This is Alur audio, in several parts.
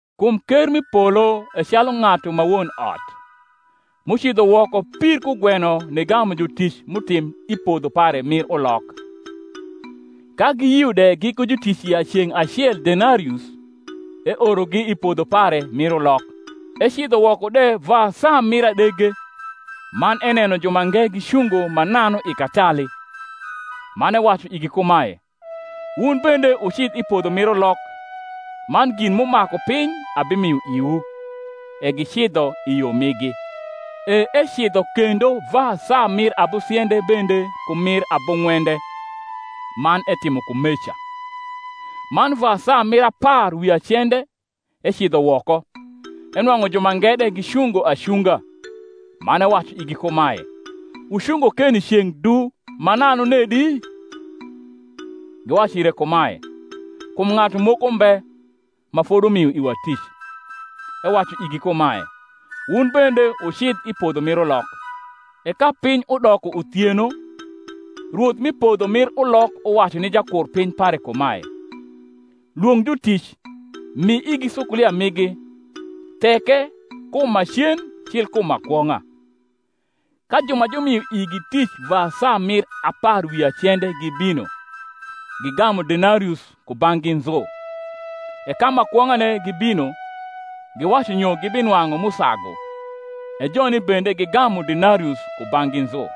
Kum ker m’i polo e calu ng’atu ma won ot, m’ucidho woko pir kugweno nigamu jutic m’utim i podho pare mir ulok. Ka giyio de giku jutic ya ceng’ acel denarius, eorogi i podho pare mir ulok. Ecidho woko de va saa mir adege, man eneno jumange gicungo mananu i katali; man ewacu igi kumae, Wun bende wucidh i podho mir ulok, man gin m’umaku piny abimio iwu. E gicidho i yo migi. E ecidho kendo va saa mir abusiende bende ku mir abung’wende, man etimo kumeca. Man va saa mir apar wi acende ecidho woko, enwang’u jumange de gicungo acunga; man ewacu igi kumae, Wucungo keni ceng’ du mananu nedi? Giwacu ire kumae, Kum ng’atu moko mbe ma fodumio iwa tic. Ewacu igi kumae, Wun bende wucidh i podho mir ulok. E ka piny udoko uthieno, rwoth mi podho mir ulok uwacu ni jakurpiny pare kumae, Lwong’ jutic, mi igi sukulia migi, theke kum ma cen cil kum ma kwong’a. Ka ju ma jumio igi tic va saa mir apar wi acende gibino, gigamu denarius kubang’gi nzu. E ka ma kwong’ane gibino, giwacu nyo gibinwang’u m’usagu; e joni bende gigamu denarius kubang’gi nzu.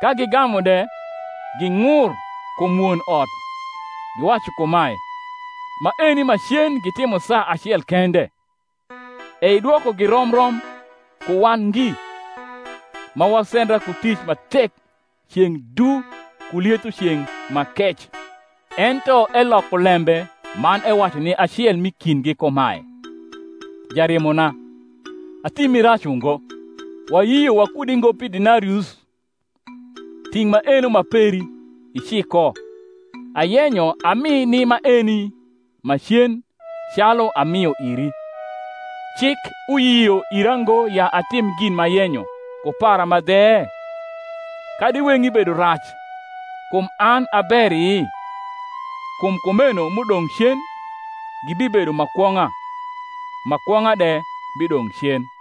Ka gigamu de, ging’ur kum won ot, giwacu kumae, Maeni ma cen gitimo saa acel kende, e idwokogi rom rom ku wan ngi, ma wasendra ku tic ma tek ceng’ du ku lietho ceng’ ma kec. Ento eloko lembe man ewacu ni acel m’i kindgi kumae, Jarimona, atimi rac ungo: wayio wakudi ngo pi denarius? Ting’ maeno ma peri, ici ko; ayenyo ami ni maeni ma cen, calu amio iri. Cik uyio ira ngo ya atim gin m’ayenyo ku para ma dhe? kadi weng’i bedo rac, kum an a beri? Kum kumeno m’udong’ cen gibibedo ma kwong’a, ma kwong’a de bidong’ cen.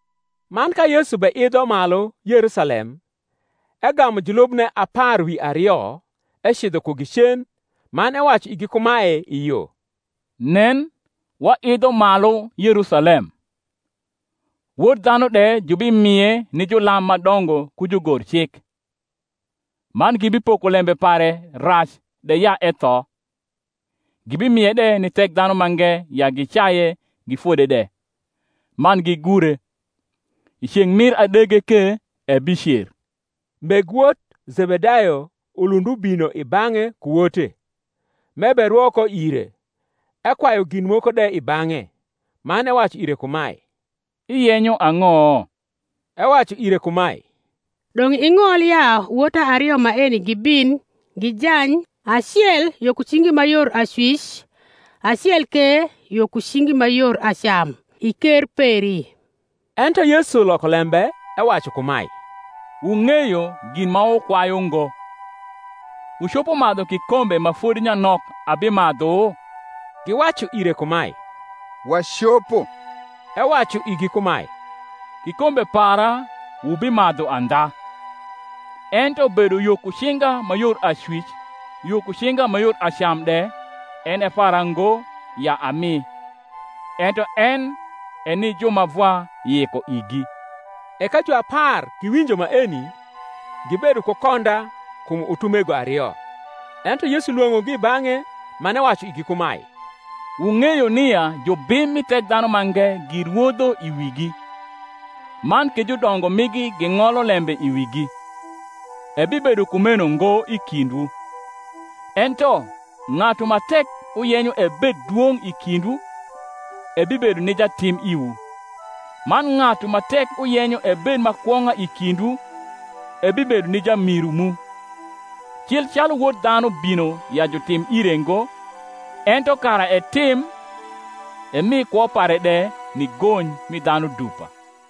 Man ka Yesu beidho malu Yerusalem, egamu julubne apar wi ario ecidho kugi cen, man ewacu igi kumae i yo, Nen, waidho malu Yerusalem; Wod dhanu de jubimie ni julam ma dongo ku jugorcik; man gibipoko lembe pare rac de ya etho, gibimie de ni Thekdhanumange ya gicaye, gifode de, man gigure: i ceng’ mir adege ke ebicer. Meg wot Zebedayo ulund ubino i bang’e ku wote, m’eberwo ko ire, ekwayu gin moko de i bang’e. Man ewacu ire kumae, Iyenyo ang’o? Ewacu ire kumae, Dong’ ing’ol ya wota ario maeni gibin gijany, acel yo ku cingi ma yor acwic, acel ke yo ku cingi ma yor acam, i ker peri. Ento Yesu loko lembe, ewacu kumae, Wung’eyo gin ma wukwayu ngo. Wucopo madhu kikombe ma fodi nyanok abimadhu? Giwacu ire kumae, Wacopo. Ewacu igi kumae, Kikombe para wubimadhu andha: ento bedo yo ku cinga ma yor acwic, yo ku cinga ma yor acam de, en e para ngo ya ami; ento en e ni ju ma Vwa yiko igi. E ka juapar giwinjo maeni, gibedo ku konda kum utumego ario. Ento Yesu lwong’ogi i bang’e, man ewacu igi kumae, Wung’eyo nia jubim mi Thekdhanumange girwodho i wigi, man ke judongo migi ging’olo lembe i wigi. Ebibedo kumeno ngo i kindwu: ento ng’atu ma tek uyenyo ebed dwong’ i kindwu, ebibedo ni jatim iwu; man ng’atu ma tek uyenyo ebed ma kwong’a i kindwu ebibedo ni jamiru mu: cil calu Wod dhanu bino ya jutim ire ngo, ento kara etim, emi kwo pare de ni gony mi dhanu dupa.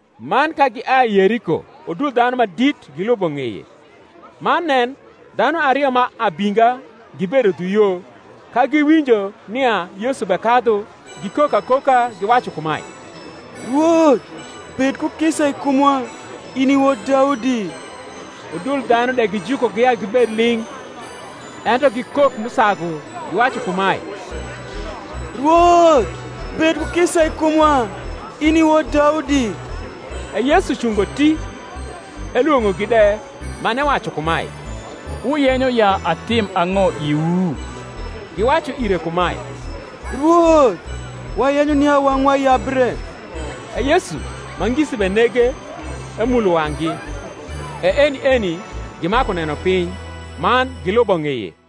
Man ka giai Yeriko udul dhanu ma dit gilubo ng’eye. Man nen, dhanu ario ma abinga gibedo dhu yo, ka giwinjo nia Yesu bekadhu, gikok akoka, giwacu kumae Rwoth, bed ku kisa i kumwa, in i wod Daudi. Udul dhanu de gijukogi ya gibed ling’: ento gikok m’usagu, giwacu kumae, Rwoth, bed ku kisa i kumwa, in i wod Daudi. E Yesu cungo ti, elwong’ogi de, man ewacu kumae, Wuyenyo ya atim ang’o iwu? Giwacu ire kumae, Rwoth, wayenyo nia wang’wa yabre. E Yesu, ma ngisi benege, emulo wang’gi: e eni eni gimaku neno piny, man gilubo ng’eye.